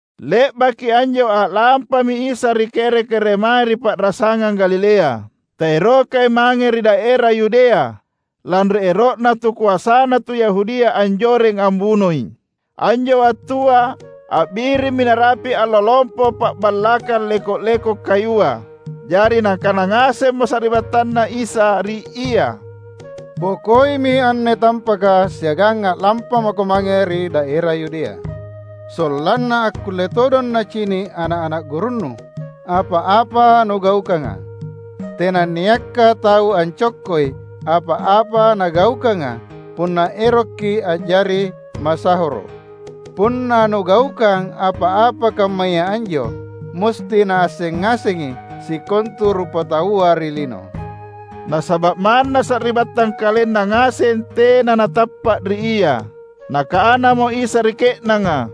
Le’baki anjo a’lampami Isa ri kere-keremae ri pa’rasangang Galilea. Taerokai mange ri daera Yudea, lanri ero’na tukoasana tu Yahudia anjoreng ambunoi. Anjo wattua a’birimmi narapi’ Allo Lompo Pa’ballakang Leko’-lekoka Kayua. Jari nakana ngasemmo sari’battanNa Isa ri Ia, "Bokoimi anne tampaka siagang a’lampa maKo mange ri daera Yudea, sollanna akkulle todong nacini’ ana’-ana’ gurunNu apa-apa Nugaukanga. Tenanniakka tau ancokkoi apa-apa nagaukanga punna eroki a’jari masahoro’. Punna Nugaukang apa-apa kammaya anjo, musti naasseng ngasengi sikontu rupataua ri lino!" (Nasaba’ manna sari’battang KalenNa ngaseng tena natappa’ riIa.) Nakanamo Isa ri ke’nanga,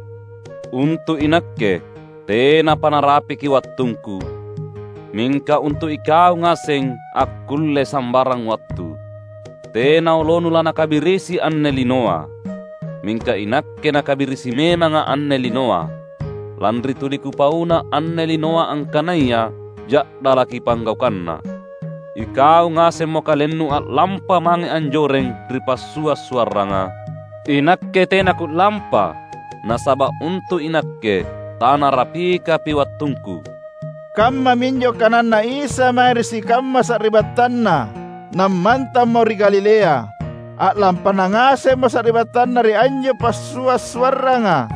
"Untu’ iNakke, tenapa narapiki wattungKu; mingka untu’ ikau ngaseng akkulle sambarang wattu. Tena olonu lanakabirisi anne linoa. Mingka iNakke nakabirisi memangA’ anne linoa, lanri tuli Kupauanna anne linoa angkanaya ja’dalaki panggaukanna. Ikau ngasemmo kalennu a’lampa mange anjoreng ri passua’-suarranga. INakke tena Ku’lampa, nasaba’ untu’ iNakke tanarapikapi wattungKu." Kammaminjo kananNa Isa mae ri sikamma sari’battanNa, nammantammo ri Galilea. A’lampana ngasemmo sari’battanNa ri anjo passua’-suarranga,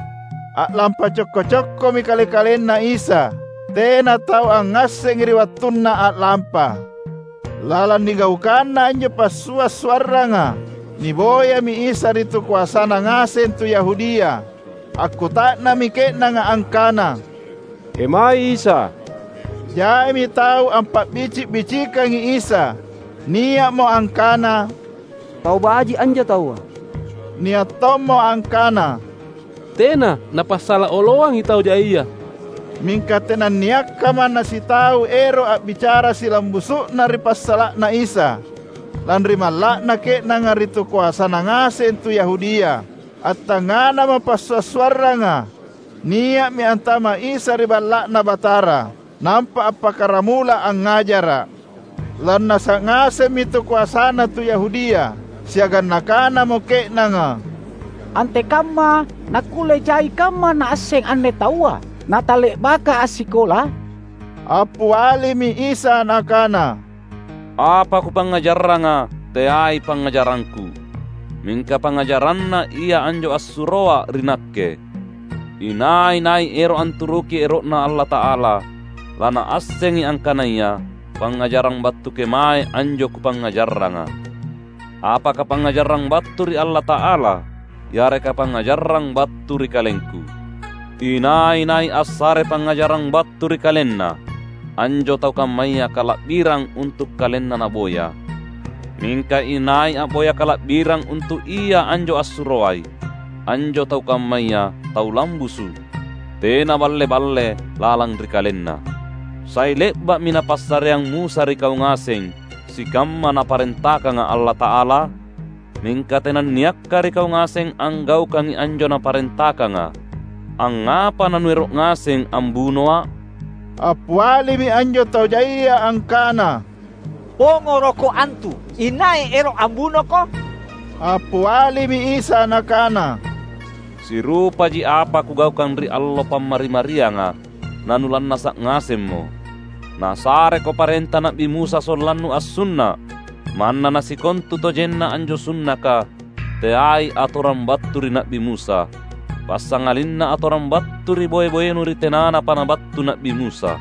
a’lampa cokko-cokkomi Kale-kalenNa Isa. Tena tau angngassengi ri wattunNa a’lampa. Lalang nigaukanna anjo passua’-suarranga, niboyami Isa ri tukoasana ngaseng tu Yahudia. Akkuta’nammi ke’nanga angkana, "Kemaei Isa?" Jaimi tau ampa’bici’-bicikangi Isa. Nia’mo angkana, "Tau baji’ anjo taua." Nia’ tommo angkana, "Tena! Napasala oloangi tau jaia." Mingka tenanniakka manna sitau ero’ a’bicara silambusu’na ri passala’na Isa, lanri malla’na ke’nanga ri tukoasana ngaseng tu Yahudia. Attangnganamo passua’-suarranga, nia’mi antama’ Isa ri Balla’Na Batara, nampa appakkaramula angngajara’. Lannasa’ ngasemmi tukoasana tu Yahudia, siagang nakanamo ke’nanga, "Antekamma nakkulle jai kamma Naasseng anne taua, natale’baka assikola?" Appialimi Isa Nakana, "Apa Kupangngajaranga teai pangngajarangKu, mingka pangngajaranNa ia anjo assuroA ri Nakke. Inai-nai ero’ anturuki ero’Na Allata’ala, lanaassengi angkanaya pangngajarang battu kemae anjo Kupangngajaranga. Apaka pangngajarang battu ri Allata’ala yareka pangngajarang battu ri KalengKu. Inai-nai assare pangngajarang battu ri kalenna, anjo tau kammaya kala’birang untu’ kalenna naboya. Mingka inai a’boya kala’birang untu’ Ia anjo assuroai, anjo tau kammaya tau lambusu’, tena balle-balle lalang ri kalenna. Sai le’ba’mi napassareang Musa ri kau ngaseng sikamma Naparentakanga Allata’ala? Mingka tenanniakka ri kau ngaseng anggaukangi anjo Naparentakanga. Angngapa nanuero’ ngaseng ambunoA’?" Appialimi anjo tau jaia angkana, "PongorokKo antu! Inai ero’ ambunoKo?" Appialimi Isa Nakana, "Sirupaji apa Kugaukang ri allo Pammari-marianga, na nulannasa’ ngasemmo. Nasareko parenta Na’bi Musa sollannu assunna’ — manna nasikontutojenna anjo sunnaka teai atorang battu ri Na’bi Musa, passangalinna atorang battu ri boe-boenu ri tenanapa nabattu Na’bi Musa.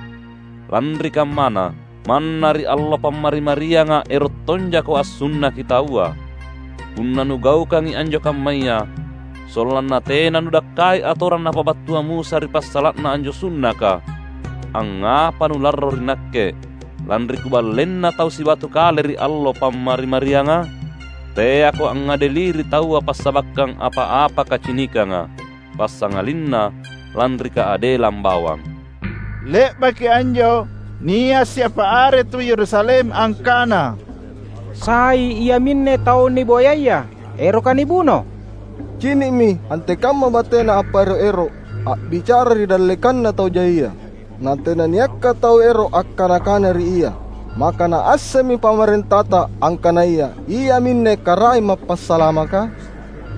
Lanri kammana, manna ri allo Pammari-marianga ero’ tonjako ansunnaki taua. Punna nugaukangi anjo kammaya sollanna tena nudakkai atorang napabattua Musa ri passala’na anjo sunnaka, angngapa nularro ri Nakke lanri Kuballeina taua sibatu kale ri allo Pammari-marianga? Teako angngadeli ri taua passabakkang apa-apa kacinikanga, passangalinna lanri kaadelang bawang." Le’baki anjo, nia’ siapa are tu Yerusalem angkana, "Sai iaminne tau niboyaya, eroka nibuno? Cini’mi antekamma bateNa appaero’-ero’ a’bicara ri dallekanna tau jaia, na tenanniakka tau ero’ akkana-kana ri Ia! Maka naassemmi pamarentata angkanaya Iaminne Karaeng Mappasalamaka?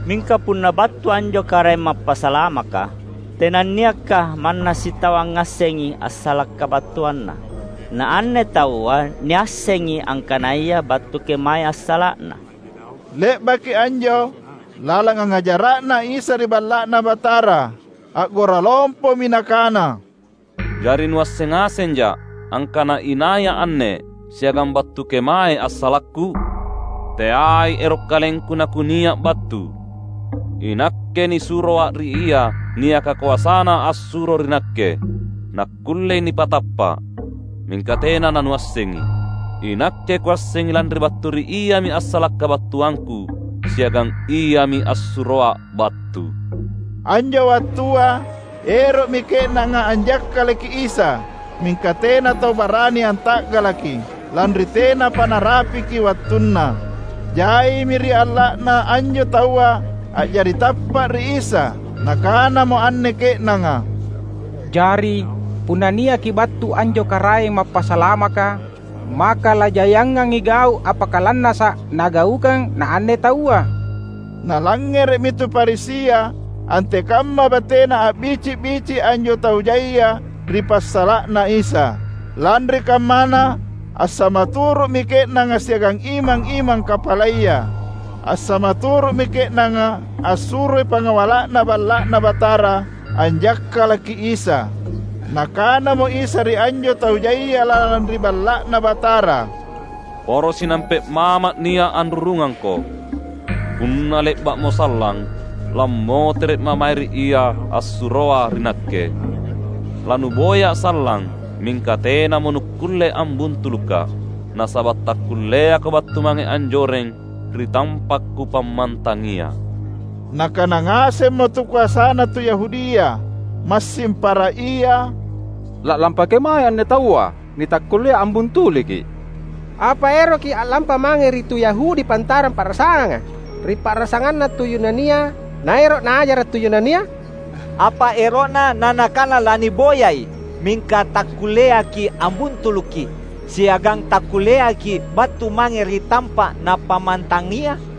Mingka punna battu anjo Karaeng Mappasalamaka, tenanniakka manna sitau angngassengi assala’ kabattuanNa! Naanne taua niassengi angkanaya battu kemaei assala’na." Le’baki anjo, lalang angngajara’Na Isa ri Balla’Na Batara, a’gora lompomi Nakana, "Jari nuasseng ngasenjA’ angkana inaiA’ anne, siagang battu kemae assalakKu? Teai ero’ KalengKu naKunia’ battu. INakke nisuroA’ ri Ia niaka koasana assuro ri Nakke, nakkullei nipatappa’. Mingka tena nanuassengi. INakke Kuassengi lanri battu ri Iami assala’ kabattuangKu, siagang Iami assuroA’ battu." Anjo wattua, ero’mi ke’nanga anjakkalaki Isa. Mingka tena tau barani anta’galaki, lanri tenapa narapiki wattunna. Jaimi ri alla’na anjo taua a’jari tappa’ ri Isa; nakanamo anne ke’nanga, "jari punna niaki battu anjo Karaeng Mappasalamaka, maka lajaiangangi gau’ appakalannasa’ Nagaukang naanne taua?" Nalangngere’mi tu Farisia antekamma batena a’bici’-bici’ anjo tau jaia ri passala’na Isa. Lanri kammana assama turu’mi ke’nanga siagang imang-imang kapalaya. Assama turu’mi ke’nanga assuroi pangawala’na Balla’Na Batara anjakkalaki Isa. Nakanamo Isa ri anjo tau jaia lalang ri Balla’Na Batara, "Poro sinampe’ maMa’ nia’ anrurungangko. Punna le’ba’mo sallang, lammotere’Ma’ mae ri Ia assuroA ri Nakke. LanuboyA’ sallang mingka tenamo nukkulle ambuntulukKa’; nasaba’ takkulleako battu mange anjoreng ri tampa’ Kupammantangia." Nakana ngasemmo tukoasana tu Yahudia, massing para ia, "La’lampa kemaei anne taua nitakkullea ambuntuluKi? Apa eroKi a’lampa mange ri tu Yahudi pantarang pa’rasanganga, ri pa’rasanganna tu Yunania, naero’ Naajara’ tu Yunania? Apa ero’Na naNakana laniboyai mingka takkulleaki’ ambuntuluKi, siagang takkulleaki’ battu mange ri tampa’ Napammantangia?"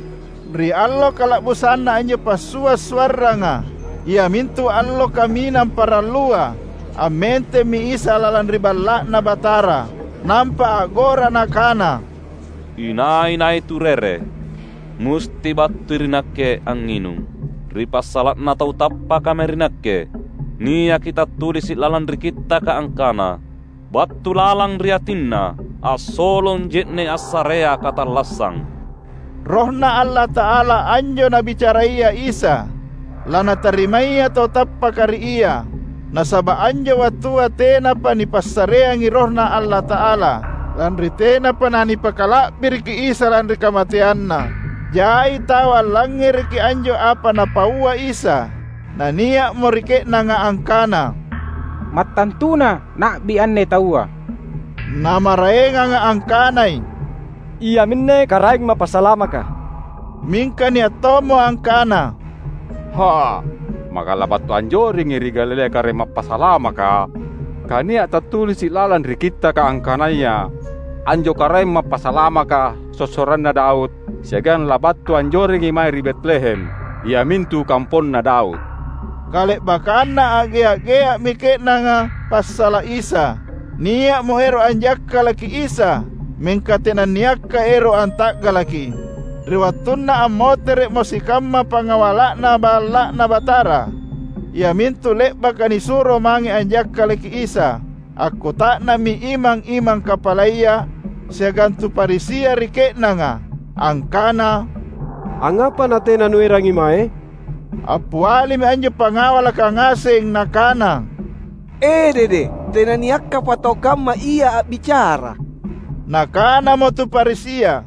Ri allo kala’busanna anjo passua’-suarranga, iamintu allo kaminang parallua, ammentemmi Isa lalang ri Balla’Na Batara. Nampa a’gora Nakana, "Inai-nai turere, musti battui ri Nakke angnginung. Ri passala’na tau tappaka mae ri Nakke, niaki tattulisi’ lalang ri Kittaka angkana, ‘Battu lalang ri atinna assolong je’ne’ assarea katallassang.’" (RohNa Allata’ala anjo Nabicaraya Isa, lanatarimaya tautappaka ri Ia. Nasaba’ anjo wattua tenapa nipassareangi RohNa Allata’ala; lanri tenapa nanipakala’biriki Isa lanri kamateanNa.) Jai tau allangngereki anjo apa Napaua Isa. Na nia’mo ri ke’nanga angkana, "Mattantuna Na’bi anne Taua!" Na maraenganga angkanai, "Iaminne Karaeng Mappasalamaka!" Mingka nia’ tommo angkana, "Ha, maka labattu anjorengi ri Galilea Karaeng Mappasalamaka? Kania’ tattulisi’ lalang ri Kittaka angkanaya anjo Karaeng Mappasalamaka sossoranna Daud siagang labattu anjorengi mae ri Betlehem, iamintu kamponna Daud." Kale’bakkanna a’gea-gea’mi ke’nanga passala’ Isa. Nia’mo ero’ anjakkalaki Isa, mingka tenanniakka ero’ anta’galaKi. Ri wattunna ammotere’mo sikamma pangawala’na Balla’Na Batara, iamintu le’baka nisuro mange anjakkalaki Isa, akkuta’nammi imang-imang kapalaya, siagang tu Farisia ri ke’nanga, angkana, "Angngapa natena nuerangi mae?" Appialimi anjo pangawalaka ngaseng nakana, "Edede, tenanniakkapa tau kamma Ia a’bicara!" Nakanamo tu Farisia,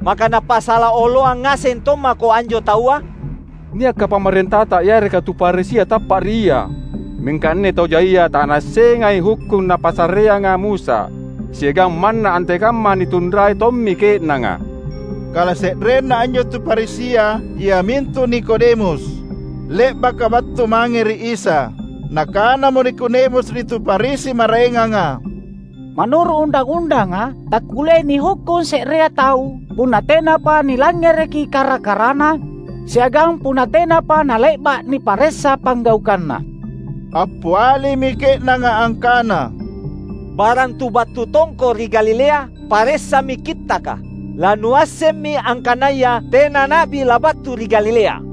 "Maka napasala oloang ngaseng tommako anjo Taua? Niakka pamarentata yareka tu Farisi tappa’ ri Ia? Mingka anne tau jaia tanaassengai hukkung napassareanga Musa, siagang manna antekamma nitunrai tommi ke’nanga." Kalase’renna anjo tu Farisia iamintu Nikodemus, le’baka battu mange ri Isa. Nakanamo Nikodemus ri tu Farisi maraenganga, "Manuru’ undang-undanga, takkulleai nihukkung se’rea tau punna tenapa nilangngereki kara-karana siagang punna tenapa nale’ba’ niparessa panggaukanna." Appialimi ke’nanga angkana, "Barang tu battu tongko ri Galilea? Paressami Kittaka! Lanuassemmi angkanaya tena na’bi labattu ri Galilea."